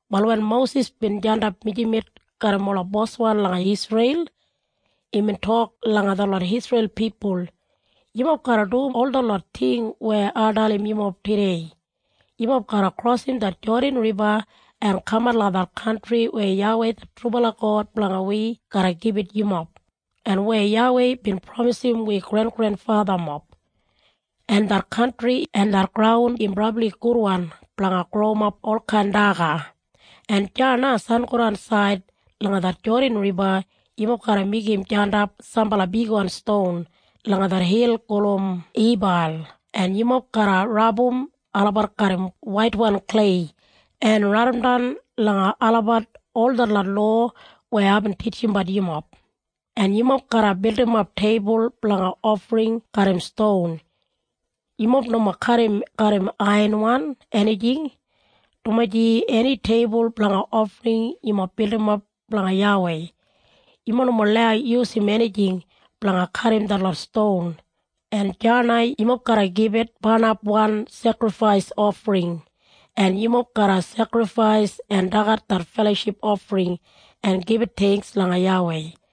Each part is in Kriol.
Wal wen Mosis bin jandap mijamet garram ola boswan langa Isreil, imbin tok langa detlot Isreil pipul, “Yumob garra dum ol detlot ting weya ai dalim yumob tudei. Yumob garra krosim det Jodan Riba en kamat langa det kantri weya YAWEI det trubala God blanga wi garra gibit yumob, en weya YAWEI bin pramisim wi grengrenfathamob. En det kantri en det graun im brabli gudwan blanga growimap olkain daga. En deya na sangodansaid langa det Jodan Riba, yumob garra meigim jandap sambala bigwan ston langa det hil gulum Ibal en yumob garra rabum olabat garram waitwan klei en raidimdan langa olabat ol detlot lowa weya aibin titjimbat yumob. En yumob garra bildimap teibul blanga ofring garram ston. Yumob nomo kadim garram aiyanwan enijing, dumaji eni teibul blanga ofring yumob bildimap blanga YAWEI, yumob nomo lau yusum enijing blanga kadim detlot ston. En deya na yumob garra gibit barnapwan sekrifais ofring, en yumob garra sekrifais en dagat det feloship ofring en gibit theingks langa YAWEI.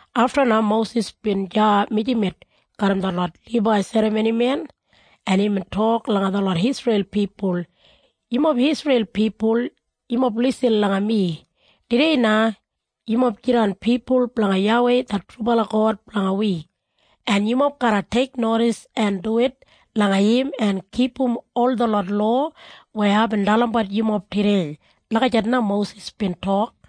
Afta na Mosis bin deya mijamet garram detlot Libai serramonimen, en imbin tok langa detlot Isreil pipul, “Yumob Isreil pipul, yumob lisin langa mi. Tudei na, yumob jidan pipul blanga YAWEI det trubala God blanga wi, en yumob garra teiknodis en duwit langa im en kipum ol detlot lowa weya aibin dalimbat yumob tudei.” Lagijat na Mosis bin tok.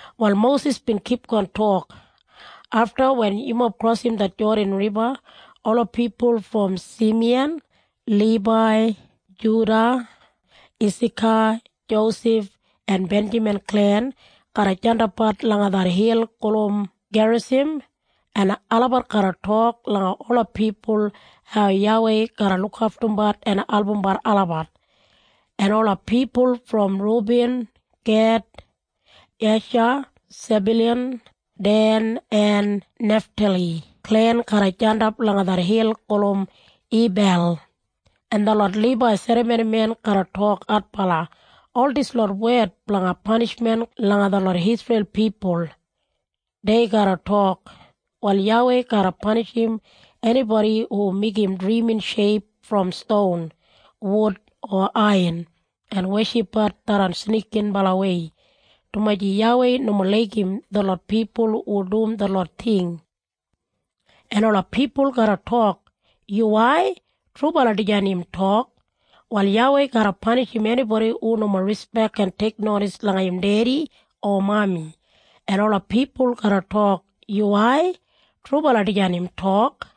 Wal Mosis bin kipgon tok, “Afta wen yumob krosim det Jodan Riba ola pipul brom Simiyan, Libai, Juda, Isaka, Josef en Benjamin klen garra jandapbat langa det hil gulum Gerisim, en olabat garra tok langa ola pipul hau YAWEI garra lukaftumbat en albumbat olabat. En ola pipul brom Rubin, Ged, Esha, Sebyulan, Den en Neftali klen garra jandap langa det hil gulum Ibal, en detlot Libai serramonimen garra tok adbala ol dislot wed blanga panishmen langa detlot Isreil pipul. “Dei garra tok, ‘Wal YAWEI garra panishim enibodi hu meigim drimin sheip brom ston, wud, o aiyan en weshipbat tharran snikibalawei, dumaji YAWEI nomo laigim detlot pipul hu dum detlot ting.’ “En ola pipul garra tok, ‘Yuwai! Trubala dijan im tok!’ “‘Wal YAWEI garra panishim enibodi hu nomo rispek en teiknodis langa im dedi o mami.’ “En ola pipul garra tok, ‘Yuwai! Trubala dijan im tok!’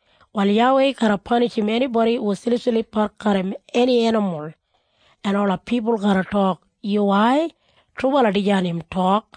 “‘Wal YAWEI garra panishim enibodi hu silipsilipbat garram eni enimul.’ “En ola pipul garra tok, ‘Yuwai! Trubala dijan im tok!’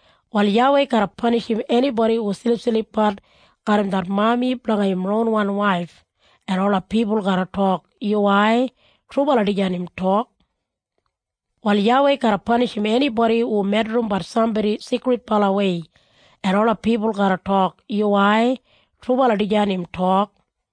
“‘Wal YAWEI garra panishim enibodi hu silipsilipbat garram det mami blanga im ronwan waif.’ “En ola pipul garra tok, ‘Yuwai! Trubala dijan im tok!’ “‘Wal YAWEI garra panishim enibodi hu medrimbat sambodi sigridbalawei.’ “En ola pipul garra tok, ‘Yuwai! Trubala dijan im tok!’